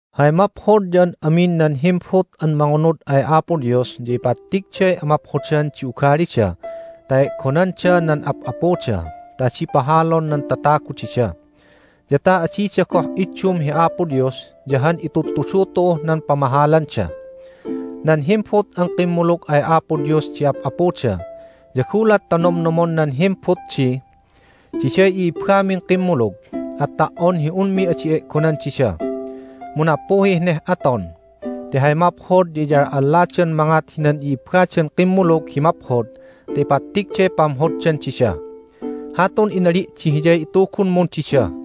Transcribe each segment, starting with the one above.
Hay maphod ya an amin nan himbut an mangunud ay Apo Dios ya ipattigday amaphodan di ugalida ta e'gonanda nan ap'apuda ta adi pahalon nan tatagu dida, ya ta adida goh iddum hi Apo Dios ya han itudtudu tu'uh nan pamahalanda. Nan himbut an kimmulug ay Apo Dios di ap'apuda ya gulat ta nomnomon nan himbut di, "Diday i'ibbamin kimmulug, at ta"on hi unmi adi e'gonan dida!" mu nappuhih neh aton, ti hay maphod ya iyal'alladan mangat hinan i'ibbadan kimmulug hi maphod ta ipattigday pamhoddan dida. Hatun inali' di hiyay itugunmun dida.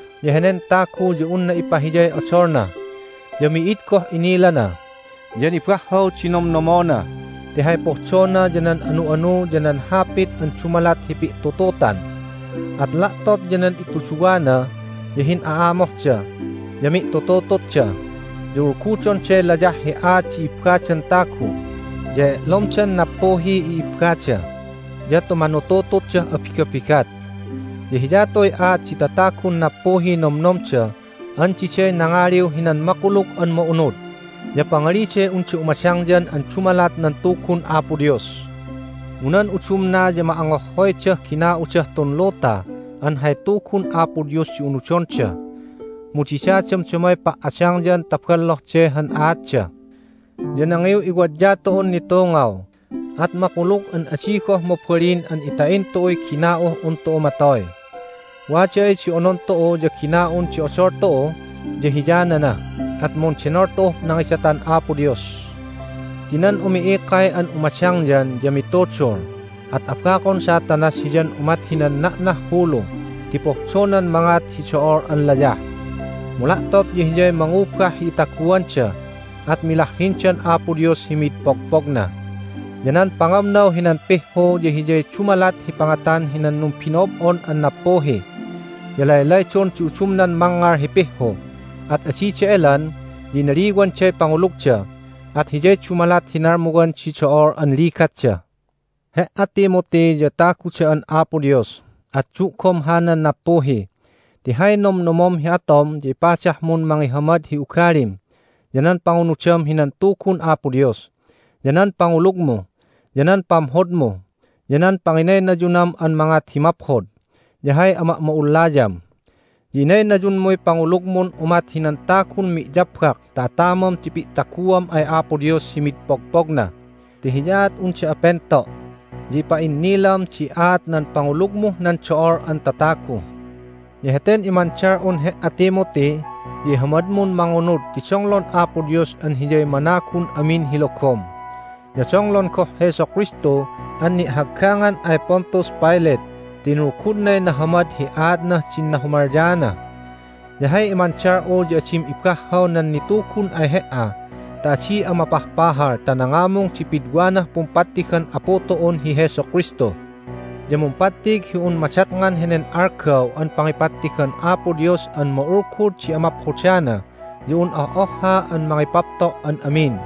ya henen tagu ya unna ipahiyay odolna, ya mi'id goh inilana, ya nibahhaw di nomnomona ti hay pohdona ya nan anu'anu ya nan hapit an dumalat hi pi'tututan. At la'tot ya nan ituduwana ya hin'a'amohda, ya mi'tututututda, ya ulgudonday layah hi aat di ibbadan tagu, ya e'lomdan nappuhiy i'ibbada, ya tumanutututdah abigabigat. Ya hiyatuy aat di tatagun nappuhiy nomnomda an diday nangaliw hinan Makulug an Ma'unud, ya pangaliday unda umadangyan an dumalat nan Tugun Apo Dios. Mu nan udumna ya ma'angohhoydah gina'udah tun luta an hay Tugun Apo Dios di unudonda. Mu dida damdamay pa"adangyan ta bolloh de han aatda. Ya nangiw'iwadya tu'un nitungaw, at makulug an adi goh mabalin an ita'in tu'uy gina'uh un tu'u matoy. Wada ay di onon tu'u ya gina'un di odol tu'u ya hiyanana, at mundenol tu'uh nangidatan Apo Dios. Ti nan umi'ikay an umadangyan ya mitudul, at abakon Satanas hiyan umat hinan na'nah hulu ti pohdonan mangat hi do'ol an layah. Mu la'tot ya hiyay mangubah hi itaguanda, at milahhindan Apo Dios hi mid pogpogna. Ya nan pangamnaw hinan pihhu ya hiyay dumalat hi pangatan hinan numbino'ob'on an nappuhi. Ya laylaydon di udumnan mangngal hi pihhu, at adida elan, ya inaliwanday pangulugda, at hiyay dumalat hi nalmuwan di do'ol an ligatda. He"a, Timothy, ya tagu da'an Apo Dios, at du'gom hanan nappuhi, ti hay nomnomom hi atom ya ipadahmun mangihamad hi ugalim, ya nan pangunudam hinan Tugun Apo Dios, ya nan pangulugmu, ya nan pamhodmu, ya nan panginaynayunam an mangat hi maphod, ya hay ama'ma'ullayam. Ya inaynayunmuy pangulugmun umat hinan tagun mi'yabbak ta atamam di pi'taguam ay Apo Dios hi mi'id pogpogna ti hiyaat un da'a pento'. Ya impa'innilam di aat nan pangulugmuh nan do'ol an tatagu. Ya heten imandal'un he"a, Timothy, ya ihamadmun mangunud ti donglon Apo Dios an Hiyay managun amin hi logom, ya donglon goh Jesu Kristu an ni'haggangan ay Pontius Pilate ti inulgudnay nahamad hi aatnah din nahumalyaana. Ya hay imandal'u ya adim ibahhaw nan nitugun ay he"a ta adi'a mapahpahal ta nangamung di pidwanah pumpattigan Apu tu'un hi Jesu Kristu. Ya mumpattig hi un madatngan henen algaw an pangipattigan Apo Dios an ma'ulgud di amaphodana ya un oh'ohha an mangipapto' an amin,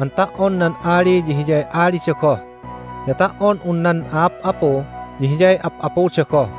an ta"on nan ali ya Hiyay alida goh, ya ta"on un nan a'ap'apu ya Hiyay ap'apuda goh.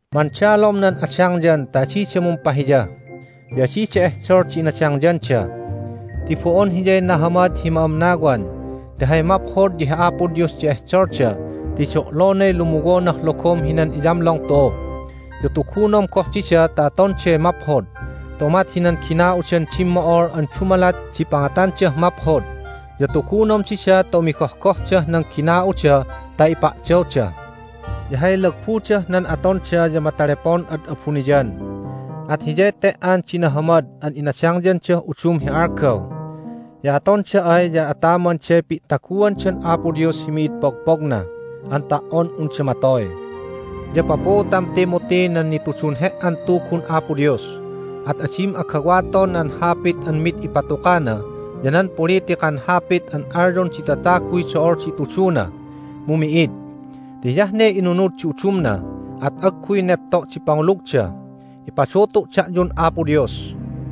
Mandalom nan adangyan ta adida mumpahiya, ya adida ehdol di inadangyanda. Ti bo'on hiyay nahamad hi ma'amnawan, ti hay maphod ya hi Apo Dios di ehdolda ti do'lonay lumuwonah logom hinan iyamlong tu'u. Ya tugunom goh dida ta atonday maphod, ta umat hinan gina'udan dimmo'ol an dumalat di pangatandah maphod. Ya tugunom dida ta umigohgohdah nan gina'uda ta ipa'dawda. Ya hay lagbudah nan atonda ya matalepon ad abuniyan, at hiyay te"an di nahamad an inadangyandah udum hi algaw. Ya atonda ay ya atamanday pi'taguandan Apo Dios hi mi'id pogpogna an ta"on unda matoy. Ya papuutam, Timothy, nan nitudun he"an Tugun Apo Dios. At adim agawaton nan hapit an mid ipatukana ya nan politikan hapit an alyon di tataguy do'ol di ituduna, mu mi'id. Ti hiyah ne inunud di udumna, at agguy nepto' di pangulugda. Ipadutu' da'yun Apo Dios.